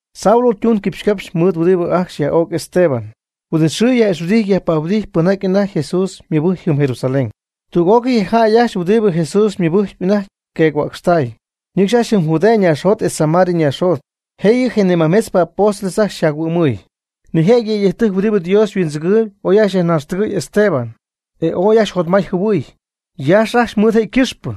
Saulo ytuun quipxycapxy mɨɨd huɨdibɨ ajcxy yaj'o'c Esteban. Huin'it xɨɨ yaj'ixhuɨdijt yajpahuɨdijt pɨnjaty anajty Jesús mɨbɨjcp jɨm Jerusalén. Tüg'ócɨy je jäy ajcxy huɨdibɨ Jesús mɨbɨjcp anajty yqueec-huäcxtay, ñɨcxy ajcxy jɨm Judea ñaaxjot etz Samaria ñaaxjot. Jëyɨ je majmetzpɨ apóstoles ajcxy jac-huɨ'mɨɨy. Nijëjɨty yëydɨjc huɨdibɨ Dios huindzɨgɨɨyb oy yajnaxtɨgɨ̈y Esteban. E ooy ajcxy jotmay jɨhuɨɨy, yaaxy ajcxy mɨɨd je' ycɨxpɨ.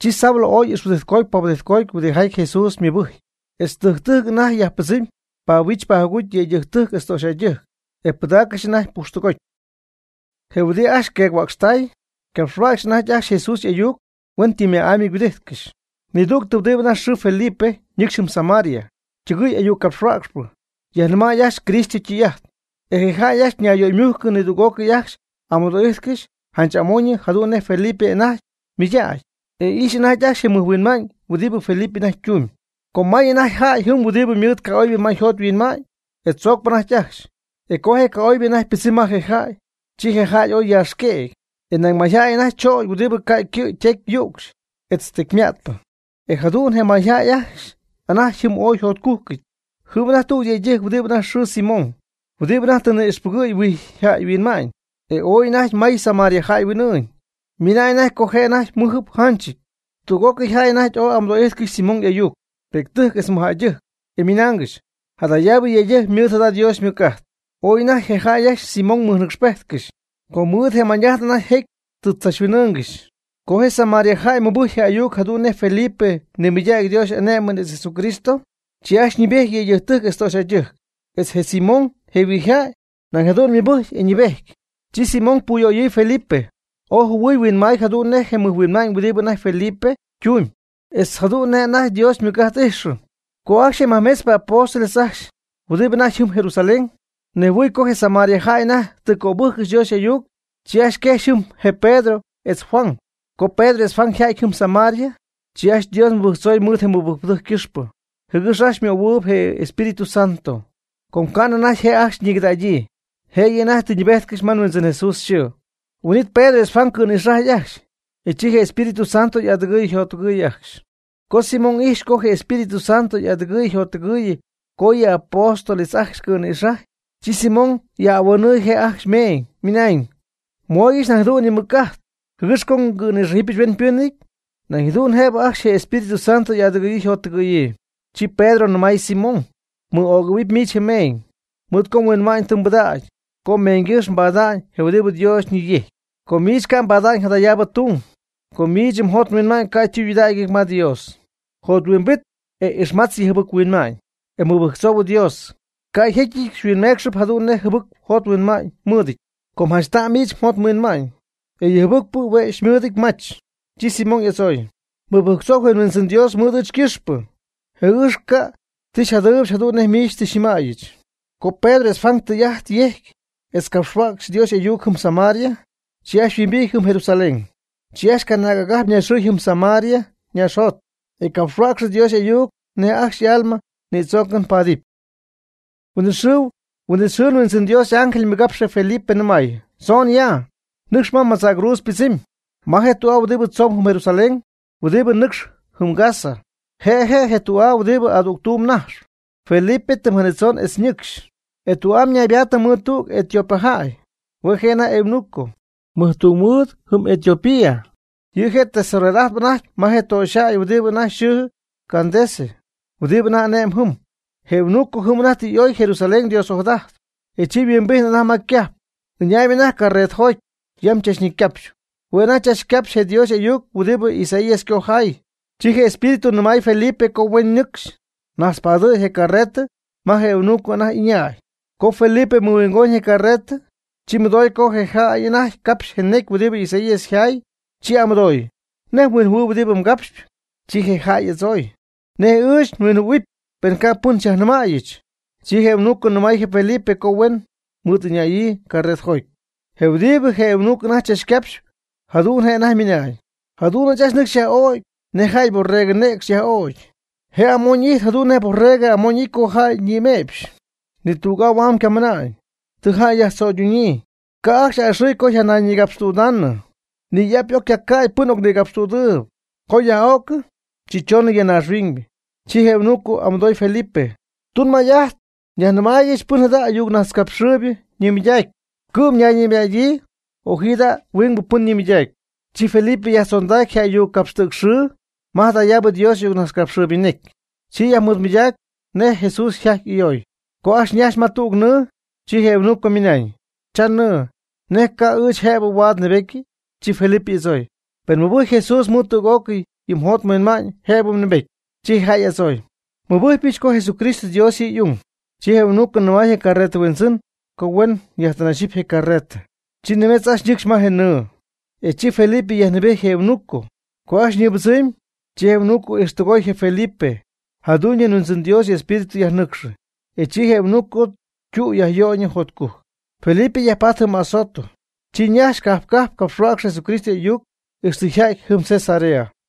Chi Saulo ooy ixhuɨdijtcoty pahuɨdijtcoty huɨdijaty Jesús mɨbɨ́jcɨp etz tɨjc tɨjc anajty yajpɨdzɨmy pahuich pajuguty yëydɨjctɨjc etz töxyjäydɨjc, e pɨdaaccɨxy anajty pujxtɨgoty. Je huidɨ ajcxy queec-huäcxtay ycapxhuäcxyp anajty ajcxy Jesús y'ayuc huen tɨm ma'amy huɨdijtcɨxy. Nidügtɨ huɨdibɨ anajty yxɨɨ Felipe ñɨcxy jɨm Samaria, ytɨgɨɨy y'ayuccapxhuäcxpɨ, yajnɨmay ajcxy Cristo ytɨy'ajt. E je jäy ajcxy ñayyöymujcɨ nidüg'ócɨy ajcxy y'amɨdo'ijtcɨxy janch amoñyɨ jadu'n nej Felipe anajty ymɨydägy e ijxyp anajty ajcxy je mɨjhuinma'ñ huɨdibɨ Felipe anajty ytumyb. Com may anajty jäy jɨm huɨdibɨ mɨɨd ca'oybɨ ma yjot yhuinma'ñ, e tzoocp anajty ajcxy. E co je ca'oybɨ anajty ypɨdzɨmy ma je jäy, chi je jäy ooy yjacyaaxqueecy. Etz nañ mayjäy anajty chögy huɨdibɨ ca' ycɨ' ytecy yücxy etz tecyma'tpɨ. E jadu'n je mayjäy ajcxy anajty jɨm ooy yjotcujcɨty. Jɨm anajty tüg yëydɨjc huɨdibɨ anajty yxɨɨ Simón huɨdibɨ anajty tɨ ni'ixpɨgɨ̈y huijyjäy huinma'ñ, e ooy anajty may Samaria jäy huin'ɨɨñ, ymɨna'ñ co je' anajty ymɨjɨty yjanchɨty. Tüg'ócɨy jäy anajty oy amɨdo'ijtcɨxy Simón y'ayuc, pi'ctɨjc etz mɨj'anäctɨjc, e ymɨnaangɨxy: ―Jadayaabɨ yëydɨjc ymɨɨd jada Dios ymɨc'ajt. Ooy anajty je jäy ajcxy Simón mɨjnɨcxpejtcɨxy, com mɨɨd je mañ'ajt anajty jecy tɨ chachhuin'ɨ́ɨnɨgɨxy. Co je Samaria jäy mɨbɨjcy je ayuc jadu'n nej Felipe ñimɨydacy Dios y'ané'mɨn etz Jesucristo, chi ajcxy ñɨɨbejty yëydɨjctɨjc etz töxyjäydɨjc. Etz je Simón, je huijyjäy, nañ jadu'n mɨbɨjcy e ñɨɨbejty. Chi Simón puyöyɨɨy Felipe, ooy jɨhuɨɨy huinmaay jadu'n nej je mɨjhuinma'ñ huɨdibɨ anajty Felipe ytumyb etz jadu'n nej anajty Dios ymɨc'ajt ijxɨ. Co ajcxy je majmetzpɨ apóstoles ajcxy, huɨdi anajty jɨm Jerusalén, nejhuɨɨy co je Samaria jäy anajty tɨ cöbɨjccɨxy Dios y'ayuc, chi ajcxy quejxy jɨm je Pedro etz Juan. Co Pedro etz Juan yja'ty jɨm Samaria, chi ajcxy Dios mɨbɨjctzoy mɨɨd je mɨbɨjcpɨdɨjc ycɨxpɨ, jɨgɨx ajcxy ymöhuɨɨyb je Espíritu Santo. Com ca'nɨ anajty je' ajcxy ñicɨdägyii, jëyɨ anajty tɨ ñɨɨbejtcɨxy ma Huindzɨn Jesús yxɨɨ. Huin'it Pedro etz Juan cɨ̈nïxajy ajcxy, e chi je Espíritu Santo y'adɨgɨɨy yjottɨgɨɨy ajcxy. Co Simón ijxy co je Espíritu Santo y'adɨgɨ̈yii yjottɨgɨ̈yii co yɨ apóstoles ajcxy ycɨ̈nïxajy, chi Simón yaj'ahuanɨɨy je' ajcxy meeñ, ymɨnañ: ―Mooygɨch nañ jadu'n yɨ mɨc'ajt jɨgɨx co ngɨ̈nïxájɨbɨch hueñypɨnɨty nañ jadu'n jëbɨ ajcxy je Espíritu Santo y'adɨgɨ̈yii yjottɨgɨ̈yii. Chi Pedro nɨmay Simón: ―Mɨ'ögɨ̈huɨpy miich mmeeñ, mɨɨd co mhuinma'ñ tɨ mbɨdägy co meeñygɨ́x mbada'ñ je huɨdibɨ Dios ñiyejcp. Com miich ca' xypaady jadayaabɨ tung, com miich mjot mhuinma'ñ ca' ytudägɨty ma Dios. Jothuimbit e ixmatz yɨ mjɨbɨc-huinma'ñ, e mɨbɨjctzou Dios, ca' jécyɨty xyhuinmeecxɨpy jadu'n nej jɨbɨc mjot mhuinma'ñ mmɨɨdɨty. Com janch ta'm miich mjot mhuinma'ñ, e yɨ jɨbɨcpɨ hue' xymɨɨdɨty mach. Chi Simón y'adzooy: ―Mɨbɨjctzou je Huindzɨn Dios mɨɨd ɨɨch ycɨxpɨ, jɨgɨx ca' ti xyjadɨpyɨch jadu'n nej miich tɨ xyñɨmäyɨch. Co Pedro etz Juan tɨy'ajt yejcy etz capxhuäcxy Dios y'ayuc jɨm Samaria, chi ajcxy yhuimbijty jɨm Jerusalén. Chi ajcxy canaag agajp ñaxɨɨy jɨm Samaria ñaaxjot, e capxhuäcxy Dios y'ayuc nej ajcxy y'alma nïdzoocɨn paadɨpy. Huin'it xɨɨ Huindzɨn Dios y'ángel mɨgapxy je Felipe, nɨmay: ―Tzoon ya, nɨcx ma madzäcruudz ypɨdzɨmy, ma je tü'aa huɨdi tzomb jɨm Jerusalén huɨdibɨ nɨcxp jɨm Gaza. Je' je' je tü'aa huɨdibɨ adügtuum najxp. Felipe tɨm janitzon e ñɨcxy, e tü'am naybaattɨ mɨɨd tüg Etiopía jäy. Hue' je' anajty eunuco, mɨjtungmɨɨd jɨm Etiopía. Yɨ' je' tesorero'ajt anajty ma je töxyjäy huɨdibɨ anajty yxɨɨ Candace huɨdibɨ anajty ane'mb jɨm. Je eunuco jɨm anajty tɨ y'oy Jerusalén Dios ojadajtp. E chi yhuimbijtnɨ anajty ma ycajp, ɨñaayb anajty carretɨjoty yam chachnecycapxy. Hue' anajty chachcapxyp je Dios y'ayuc huɨdibɨ Isaías ycojaay. Chi je Espíritu ñɨmay Felipe co huen nɨcxy najtzpadɨ̈y je carretɨ ma je eunuco anajty y'ɨñäy. Co Felipe mɨhuingoñ je carretɨ, chi mɨdoy co je jäy anajty capxy je necy huɨdi Isaías yjaay, chi y'amɨdooy: ―¿Nej mhuinjɨhuɨɨyb huɨdibɨ mgapxyp? Chi je jäy y'adzooy: ―¿Nej ɨɨch nhuinjɨhuɨ̈huɨpy pen ca' pɨn xyajnɨmäyɨch? Chi je eunuco nɨmay je Felipe co huen mɨɨd ɨñäyii carretɨjoty. Je huɨdibɨ anajty je eunuco chachcapxyp jadu'n je' anajty ymɨna'ñ: Jadu'n ajcxy nɨcxy yaj'ögy nej jäy borregɨ nɨcxy yaj'ögy. Je' amoñ'ijty jadu'n nej borregɨ amoñ'ity co jäy nïme'pxy. Ni tüg'aa huam ycamɨnañ. Tɨ jäy yajtzöyduñyii, ca' ajcxy a'ɨxɨɨy co yjanayñïgapxtüdaanɨ. Ni y'ap y'oc ycaca'ty pɨn ocnigapxtüdɨɨb. Co yaj'öcɨ, chi choonɨ ya naaxhuiñ. Chi je eunuco y'amɨdooy Felipe: ―Tunmay'ajt yajnɨmaaygɨch pɨn jada ayucnajtzcapxɨɨybɨ ñimɨydacpy, ¿cɨ'm ñayñimɨdyägyii o ji jada huingbɨ pɨn nimɨydacpy? Chi Felipe yajtzondacy je ayuc capxtɨɨcxɨn ma jadayaabɨ Dios y'ayuccojaaybɨ ñecy. Chi yajmɨɨdmɨydaacɨ nej Jesús yjajty y'ayoy. Co ajcxy ñajx ma tüg nɨɨ, chi je eunuco ymɨnañ: ―Cha nɨɨ, ¿nej ca' ɨɨch jëbɨ huaad nnɨɨbetyɨ? Chi Felipe y'adzooy: ―Pen mmɨbɨjcpy Jesús mɨɨd tüg'ócɨy yɨ mjot mhuinma'ñ jëbɨ mnɨɨbety. Chi je jäy y'adzooy: ―Nmɨbɨjcpyɨch co Jesucristo Dios yɨ' y'ung. Chi je eunuco nɨmay je carretɨ huindzɨn co huen yajtɨnayxɨpy je' carretɨ. Chi nimetz ajcxy ñɨcxy ma nɨɨ, e chi Felipe yajnɨɨbejty je eunuco. Co ajcxy ñɨɨbɨdzɨmy, chi je eunuco ijxtɨgoy je Felipe. Jadu'ñyɨ je Huindzɨn Dios y'Espíritu yajnɨcxɨ. E chi je eunuco ytü yajyöyñɨ jotcujc. Felipe yajpaty jɨm Azoto, chi ñajxy cajp cajp capxhuäcxɨ Jesucristo y'ayuc ixtɨ yja'ty jɨm Cesarea.